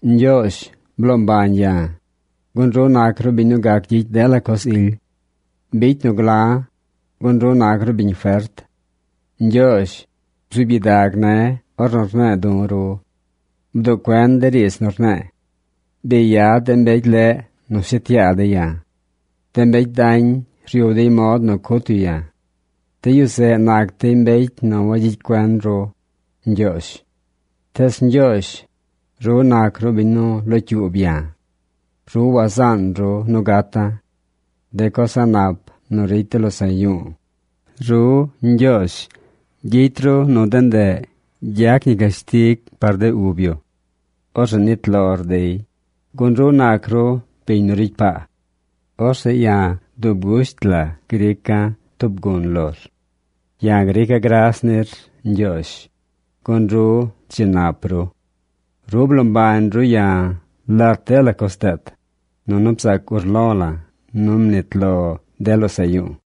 Ñgyoozh bloo mbañ ya̱, gun ru nac ru biñ nu gac gyicy dela coz ily. Bicy nu gla̱, gun ru nac ru biñ fert. Ñgyoozh, bzuub gyidag ne̱ ornu rne̱e̱ du̱ ru. Bduꞌ cuen de riidz nu rne̱e̱. Bi yad de mbecy leꞌ nu shet yaa dey ya̱. De mbecy dañ ryub dey mod nu cut yu ya̱. De yu zeꞌ nac dey mbecy nu wagyicy cuen ru, Ñgyoozh. Tees Ñgyoozh, ru nac ru biñ nu locyuub ya̱. Ru wazaan ru nu gata̱. De coz a̱ꞌ nap nu ricy de losaꞌ yu̱u̱, ru, Ñgyoozh, gyicy ru nu de ndeꞌ gyac ñi cashtig par de ub yu. Orzeꞌ nit lor dey, gun ru nac ru biñ nu ricy paa. Orzeꞌ ya̱ dub gusht la grica̱ tub gun lor. Ya̱ grica̱ gras nir, Ñgyoozh, gun ru dzi nap ru. Ru bloo mbañ ru ya̱ lat dela coz deet, nunu bzaac urlo la̱ nu mnit lo de losaꞌ yu̱u̱.